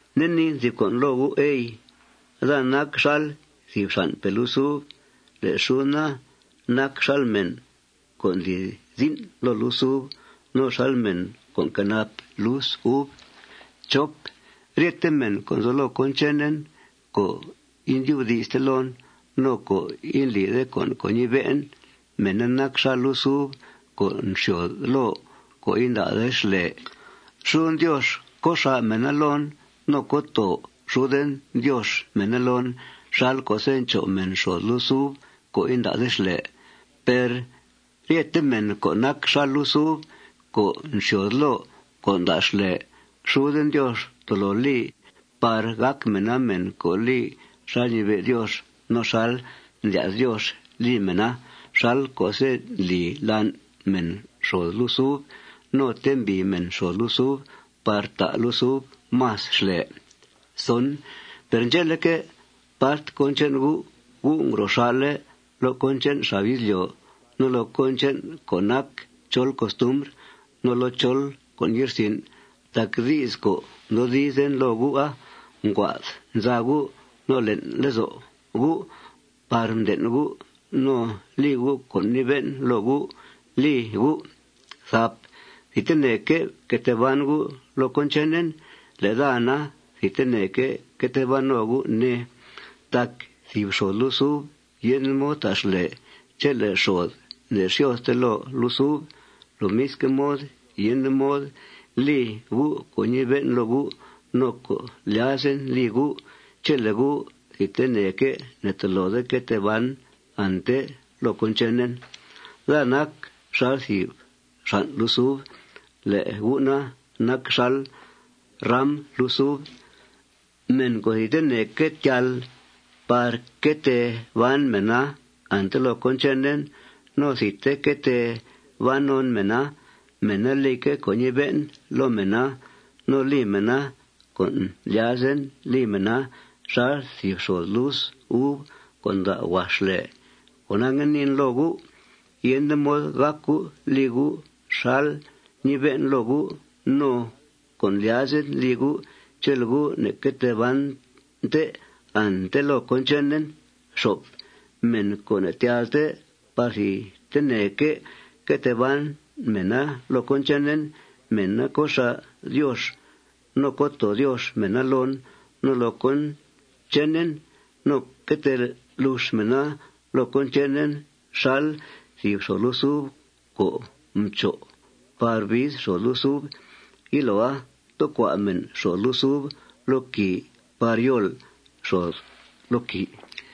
Nde niin thìb con' loo gu', ey: Daa nac xal thìb xan'pe' lus uv. Le' xuden na, nac xal mèn co' ndli zin' loo lus uv no xal mèn co' nquenap lus uv. Ryete mèn co' nzo loo cón chenen co' indyubdi'ste loon no co' indlide con' co' ñibe'en, mèna nac xal lus uv co' nxyòod loo co' inda'de xlè. Xuden Diox co' xà' mèna loon no co' too xuden Diox mèna loon xal co'se' ncho' mèn xòod lus uv co' inda'de xlè. Per ryete mèn co' nac xal lus uv co' nxyòod loo co' nda' xlè, xuden Diox tolo li par gàc mèna mèn co' li xal ñibe' Diox no xal ndlya's Diox li mèna xal co'se' ndli lan' mèn xòod lus uv no ntembìi mèn xòod lus uv par ta' lus uv más xlè. Per ndxe'leque', part cón che'n gu', gu' ngro xà'le' loo cón che'n xab izlyo' no loo cón che'n co' nac chol costumbr no loo chol con' ye'rsin' tac di's co' mdoodizlen loo gu'a nguaa'd nza gu' no le'n lezo' gu' par mden' gu' no li gu' co' mnibe'en loo gu' li gu'. Thidteneque' fque tee ban gu' loo cón chenen. Le' daa na, thidteneque' que tee ban no gu', ne. Tac thìb xòod lus uv yende mod ta' xlè chele' xòod ne'xyòodte loo lus uv. Lomisque' mod, yende mod li gu' con' ñibe'en loo gu' no co' ndlyazen li gu' chele' gu' thidteneque' ne'tolode que tee ban ante loo cón chenen. Daa nac xal thìb xan' lus uv. Le' gu' na, nac xal ram lus uv. Mèn co' thidteneque' tyal par que tee ban mèna ante loo cón chenen no thidte que tee ban non mèna, mèna lique' co' ñibe'en loo mèna. No li mèna con' ndlyazen li mèna xal thìb xòod lus uv co' nda' huax xlè. Cona, ngue niin loo gu': Yende mod gác gu' li gu' xal ñibe'en loo gu' no con' ndlyazen li gu' chele' gu' ne'que tee bante ante loo cón chenen. Mèn co' ne'tyalte par thidteneque' que tee ban mèna loo cón chenen, mèna co' xà' Diox no co' too Diox mèna loon no loo cón chenen. No que tee lux mèna loo cón chenen xal thìb xòod lus uv co' mcho' par biiz xòod lus uva. Yiloa, tecua' mèn xòod lus uva loo quìi par yol xòod loo quìi.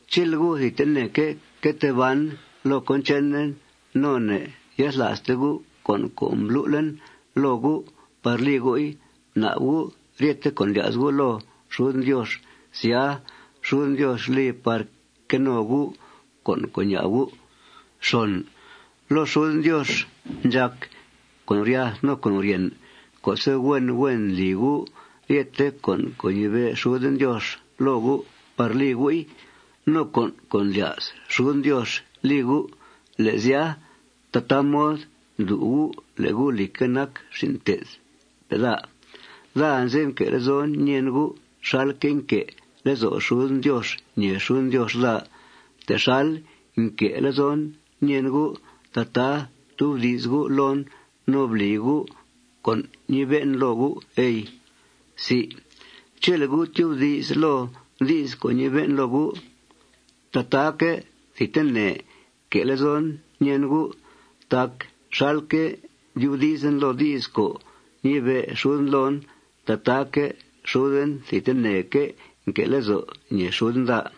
Chele' gu' thidteneque' que tee ban loo cón chenen no ne'yathla'ste gu' con' co' mblu'en loo gu' par li gu'i, bna'b gu' ryete con' ndlya's gu' loo xuden Diox. Sya, xuden Diox li par que no gu' con' co' ña'b gu'. Loo xuden Diox ndxàc con' guryath no con' guryèn co'se' huen huen ndli gu' ryethe con' co' ñibe' xuden Diox loo gu' par li gu'i no con' co' ndlya's xuden Diox li gu'. Le' sya, tataa mod ndlu' gu' le' gu', lìcque', nac xin' mté'thpe' daa. Daa anze'f nque' lezo' ñèen gu' xalque' nque' lezo' xuden Diox ñèe xuden Diox daa. Texal nque' lezon ñèen gu', tataa ftubdi's gu' loon no bli gu' con' ñibe'en loo gu', ey. Chele' gu' tyubdi's loo di's co' ñibe'en loo gu', tataaque' thidtene que' lezon ñèen gu'. Tac xalque' ndyubdizen loo di's co' ñibe' xuden loon, tataaque' xuden thidteneque' nque'que' lezo' ñèe xuden daa.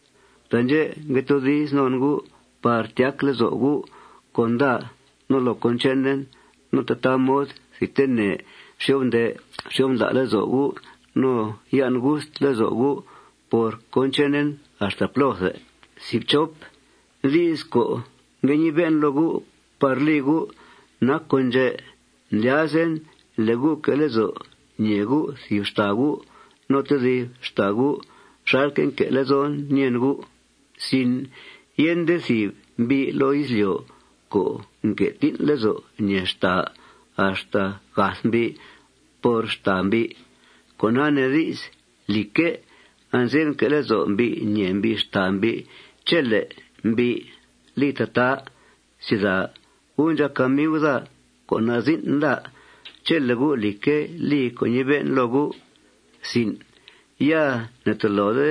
Taandxè' ngue toodiz non gu' par tyac lezo' gu' con daa no loo cón chenen. No tataa mod thidtene xyo'f nde' xyo'f ndla' lezo' gu' no yan' gust lezo' gu' por cón chenen axta plóthe. Di's co' ngue ñibe'en loo gu' par li gu' nac con' ndxè': Ndlyazen le' gu' que' lezo' ñèe gu' thìb xtàa gu' no tedib xtàa gu' xalque' nque' lezon ñèen gu'. Yende thìb mbi' loo izlyo' co' nque' tín' lezo' ñèe xtàa axta gath mbi' por xtàa mbi'. Con'a nee di's, lìcque', anze'f nque' lezo' mbi' ñèe mbi' xtàa mbi' chele' mbi' li tataa. Gu' ndxàc amiu daa co' nazin' daa chele' gu', lìcque', li co' ñibe'en loo gu'. Ya ne'tolode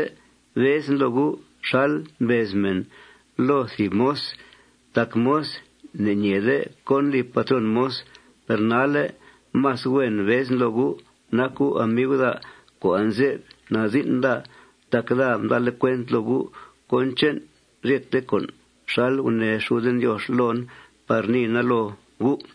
bezen loo gu' xal mbez mèn loo thìb moz tac moz ne'ñeeede cón li patrón moz. Per nalle' más huen bezen loo gu' nac gu' amiu daa co' anze'f nazin' daa tac daa mda'le' cuent loo gu' cón che'n ryete con' xal gunee xuden Diox loon par niina loo gu'.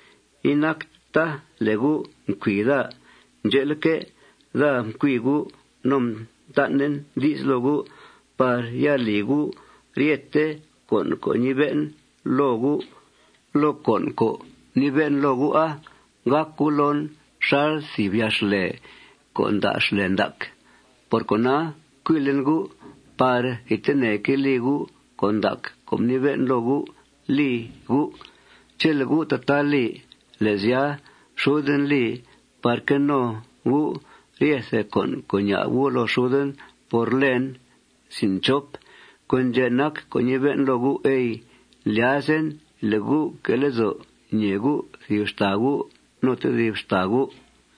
Inacta le' gu' mcui daa. Ndxe'leque', daa mcui gu'. No mtan'en di's loo gu' par ya li gu' ryethe con' co' mnibe'en loo gu'. Loo con' co' mnibe'en loo gu'a, gàc gu' loon xal thìb yaa xlè co' nda' xlè ndac. Por cona, mcuilen gu' par thidteneque' li gu' con' ndac co' mnibe'en loo gu' li gu'. Chele' gu' tataa li, le' sya, xuden li par que no gu' ryethe con' co' ña'b gu' loo xuden por lèen. Con' ndxè' nac co' ñibe'en loo gu', ey: Ndlyazen le' gu' que' lezo' ñèe gu' thìb xtàa gu' no tedib xtàa gu'.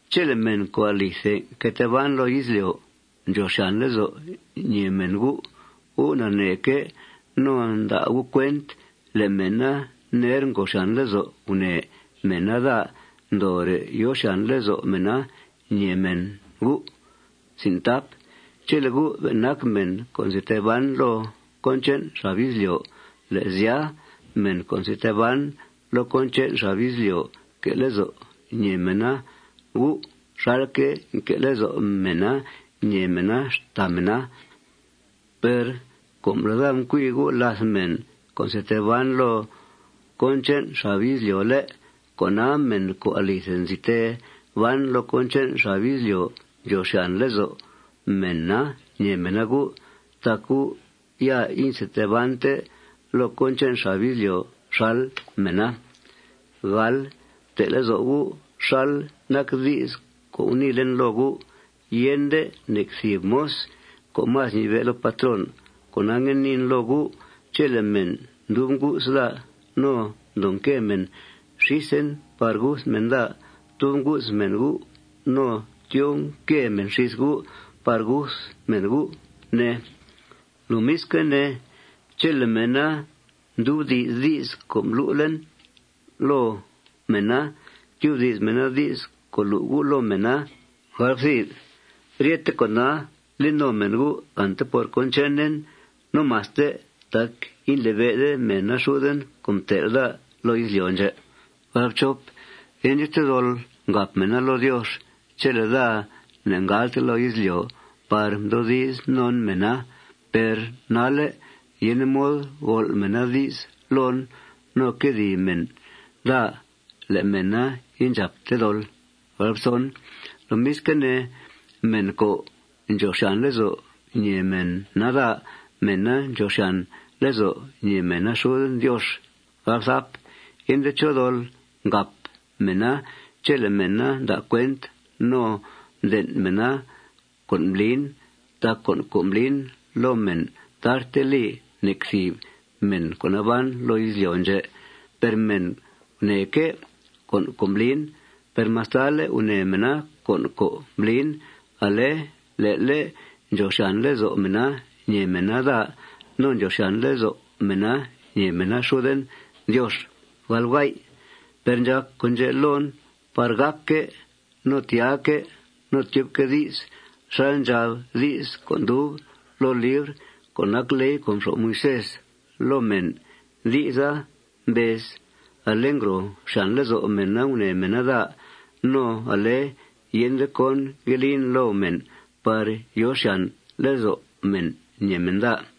Chele' mèn co' alithe nque tee ban loo izlyo' ndxòo xyàn lezo' ñèe mèn gu', gu' naneeque' no nda' gu' cuent le' mèna ner ngòo xyàn lezo' gunèe mèna daa ndoore' yòo xyàn lezo' mèna ñèe mèn gu'. Chele' gu' be' nac mèn co' nzi tee ban loo cón che'n xab izlyo', le' sya, mèn co' nzi tee ban loo cón che'n xab izlyo', que' lezo' ñèe mèna gu' xalque' nque' lezo' mèna ñèe mèna xtàa mèna. Per com le' daa mcui gu' làth mèn co' nzi tee ban loo cón che'n xab izlyo', ¿lé'?, cona, mèn co' alithe nzi tee ban loo cón che'n xab izlyo' ndxòo xyàn lezo' mèna ñèe mèna gu' tac gu' ya inzi tee bante loo cón che'n xab izlyo' xal mèna. Fte' lezo' gu' xal nac di's co' guniilen loo gu': Yende nec thìb moz co' más ñibe' loo patrón. Cona, ngue niin loo gu': Chele' mèn mdub ngu's daa no ndoo nque mèn xísen par guth mèn daa, tub ngu's mèn gu' no tyoo nque mèn xís gu' par guth mèn gu', ne. Lomisque' ne, chele' mèna mdyubdi's di's co' mblu'en loo mèna, tyubdi's mèna di's co' lu' gu' loo mèna. Ryete con'a li no mèn gu' ante por cón chenen no maste tac indlibe'de mèna xuden co' mtel' daa loo izlyo' ndxè'. Yende chó dol ngàp mèna loo Diox chele' daa ne'ngalte loo izlyo' par mdoodiz non mèna. Per nalle' yende mod gol' mèna di's loon no quedìi mèn daa le' mèna indxàpte dol. Lomisque' ne, mèn co' ndxòo xyàn lezo' ñèe mèna daa, mèna ndxòo xyàn lezo' ñèe mèna xuden Diox. Yende chó dol ngàp mèna chele' mèna nda' cuent no mden' mèna cón mblin. Tac con' co' mblin loo mèn tarte li nec thìb mèn co' naban loo izlyo' ndxè'. Per mèna gunèeque' con' co' mblin. Per mastale' gunèe mèna con' co' mblin, ale le'le' ndxòo xyàn lezo' mèna ñèe mèna daa no ndxòo xyàn lezo' mèna ñèe mèna xuden Diox. Per ndxàc con' ndxè' loon par gàcque' no tyaaque' no tyubque' di's xal ndxab di's co' ndub loo libr co' nac ley co' mxo'f Moisés loo mèn. Di'sa mbez: Ale ngòo xyàn lezo' mèn gunèe mèn daa. No ale yende con' ngue lin loo mèn par yòo xyàn lezo' mèn ñèe mèn daa.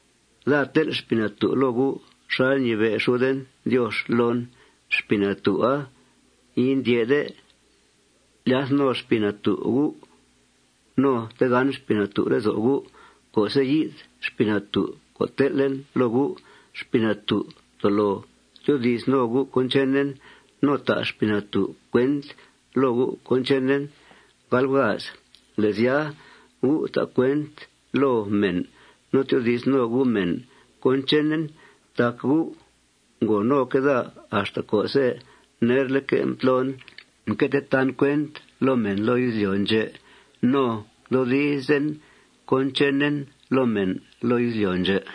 Daa tel' Xpii Natú' loo gu' xal ñibe' xuden Diox loon. Xpii Natú'a indyè'de. Lyath no Xpii Natú' gu' no tegán Xpii Natú' lezo' gu'. Co'se' yi'th Xpii Natú' co' tel'en loo gu', Xpii Natú' tolo tyoodi's no gu' cón chenen. No ta' Xpii Natú' cuent loo gu' cón chenen. Le' sya, gu' ta' cuent loo mèn no tyoodi's no gu' mèn cón chenen tac gu' ngo noque' daa axta co'se' nerleque' mtlon mque tee tan cuent loo mèn loo izlyo' ndxè' no mdoodizen cón chenen loo mèn loo izlyo' ndxè'.